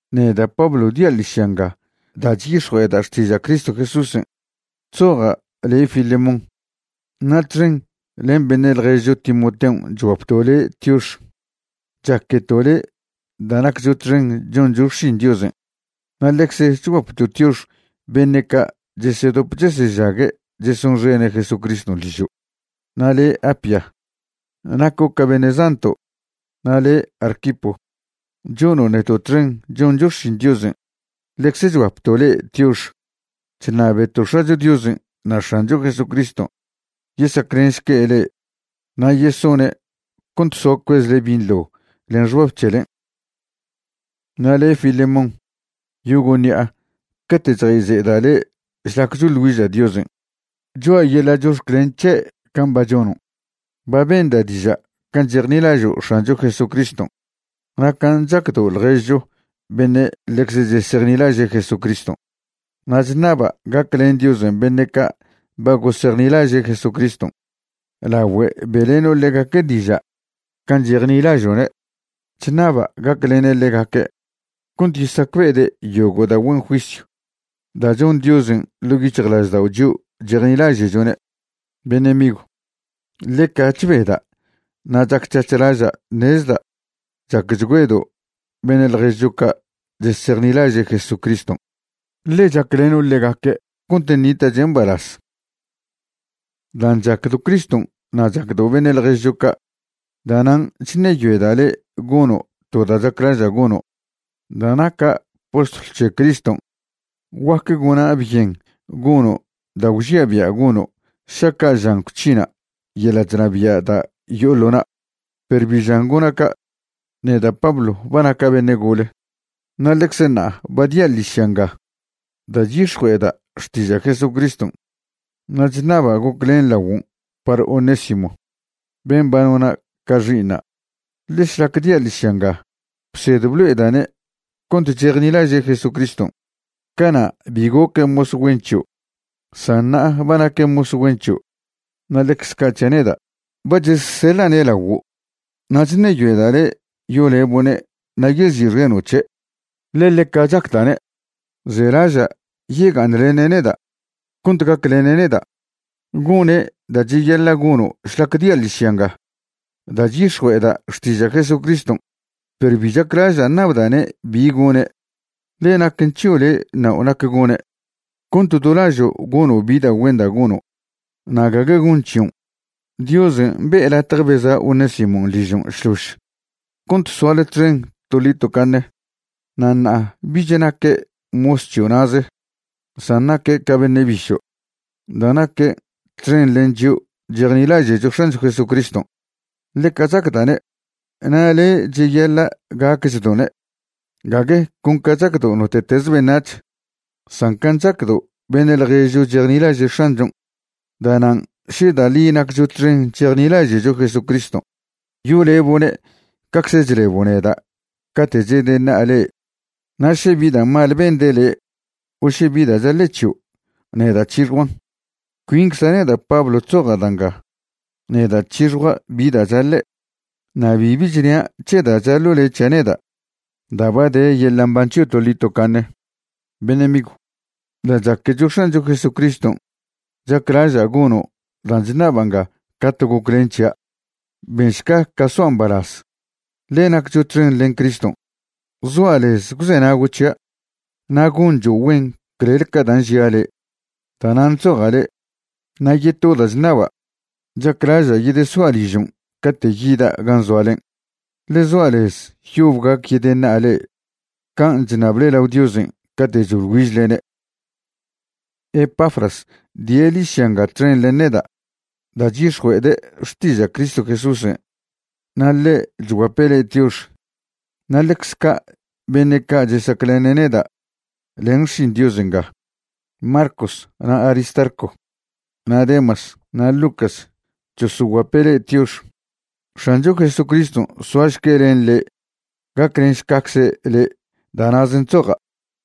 Neda' Pablo dia' ḻižya nga da' chyix̱jue'eda' xtiža' Cristo Jesúsen'. Chzoja' le' Filemón, na' txen len beṉe' ḻježcho Timoteon' chguapto' le' tiox. Chaqueto' le' da' naccho txen choncho xšin Diosen'. Na' ḻecze chguapto' tiox beṉe' ca' chesedop chesežague' chesonxene' Jesucriston' ližo'. Na' le' Apia, naco' ca beṉe' zanto', na' le' Arquipo, chono' neto' txen choncho xšin Diosen', ḻecze chguapto' le'e tiox. Chṉabeto' X̱acho Diosen' na' X̱ancho Jesucriston' yesaclenšque' le'e na' yesone' cont soa cuezle binḻo len xbab c̱helen'. Na' le' Filemón, yogo' ṉi'a cate' chjayze'eda' le' šlac choḻ güiža' Diosen', choa' yeḻa' chox̱clen c̱he' can' ba chono'. Ba benda' diža' can' chejnilažo' X̱ancho Jesucriston' na' can' chacdo' ḻježcho beṉe' ḻecze chesejnilaže' Jesucriston'. Na' chṉaba' gaclen Diosen' beṉe' ca' ba gosejnilaže' Jesucriston' lagüe be'leno' ḻegaque' diža' can' chejnilažo'ne'. Chṉaba' gaclene' ḻegaque' cont yesacbe'ede' yogo' da' güen juisyw da' chon Diosen' ḻo' yic̱hjlaždao' chio' chejnilaže'chone'. Beṉe' migw, ḻeca chbeda' na' chac c̱hac̱h laža' ṉezda' chacchgüedo' beṉe' ḻježcho ca' chesejnilaže' Jesucriston', ḻe chacleno' ḻegaque' cont ṉita'che' mbalaz. Dan' chacdo' Criston' na' chacdo' beṉe' ḻježo' ca', da'nan' chṉeyoeda' le' gono' to da' chaclaža' gono'. Da' naca' postlw c̱he Criston' guac gona' byen gono' da' gwžia' bia' gono' šaca' žan gwc̱hina' yeḻa' chnabia' da' yo'o ḻo na'. Perw bi žan gona' ca'. Neda' Pablo ba naca' beṉe' gole na' ḻecze ṉa'a ba dia' ḻižya nga da' chyix̱jue'eda' xtiža' Jesucriston'. Na' chṉaba' goclen laguon' par Onésimo ben' ba nona' ca xi'iṉa'. Ḻe šlac dia' ḻižya nga bsed blo'eda'ne' cont chejnilaže' Jesucriston'. Cana' bi goque' mos güen c̱hio', san ṉa'a ba naque' mos güen c̱hio' na' ḻecze ca' c̱hia' neda'. Ba chezseḻa'ne' laguo', na' chṉeyoeda' le' yolebo'ne' na' yezi'xeno' c̱he', ḻe ḻeca chacda'ne'. Zelaža' yega'aṉlene' neda' cont gaclene' neda', gone' da' cheyaḻa' gono' šlac dia' ḻižya nga da' chyix̱jue'eda' xtiža' Jesucriston'. Perw bi chaclaža' ṉabda'ne' bi gone', ḻe naquen c̱hio' le' ṉao' nac gone', cont do lažo' gono' bi da' güen da' gono' na' gague gonc̱hi'on. Diosen' be'e latje beza' Onésimon' ližon' šlož cont soale txen toḻi tocaṉe. Na' ṉa'a bich naque' mos c̱hio' na'ze san naque' ca beṉe' bišo' da' naque' txen len chio' chejnilaže'cho X̱ancho Jesucriston'. Ḻeca chacda'ne', na' le' cheyaḻa' gacchdo'ne', gague con ca chacdo' note'teze beṉac̱h, san can' chacdo' beṉe' ḻježo' chesejnilaže' X̱anchon'. Da'nan' še da' ḻi naccho txen chejnilaže'cho Jesucriston', yolebo'ne' cacze chlebo' neda' cate' chedeṉa'a le'e. Na' še bi da' mal bende' le' o še bi da' chaḻe' c̱hio', neda' c̱hixjuan'. Cuincza' neda' Pablo chzoja' da' nga, neda' c̱hixjua' bi da' chaḻe'. Na' bibi chnia' c̱he da' chaḻo' le' c̱hia' neda' da' ba de yeḻa' mban c̱hio' toḻi tocaṉe. Beṉe' migw, da' chaquecho X̱ancho Jesucriston' chaclaža' gono' dan' chṉaba' nga ca to goclen c̱hia'. Benšca ca soa' mbalaz, ḻe naccho txen len Criston'. Zoa' lez gwzenago' c̱hia' na' goncho' güen clel ca dan' žia' le', da'nan' chzoja' le'. Na' yeto da' chṉaba', chaclaža' yedesoa' ližon' cate' yida' gan' zoalen'. Ḻe zoa' lez yob gac yedyeṉa'a le'e can' chṉable lao Diosen' cate' choḻ güižlene'. Epafras die' ḻižya nga txen len neda' da' chyix̱jue'ede' xtiža' Cristo Jesúsen'. Na' ḻe' chguape' le'e tiox. Na' ḻecz ca' beṉe' ca' chesaclene' neda' len xšin Diosen' nga, Marcos, na' Aristarco, na' Demas, na' Lucas, chosoguape' le'e tiox. X̱ancho Jesucriston' soašque' len le' gaclenšcacze' le'. Da' na'zen' chzoja'.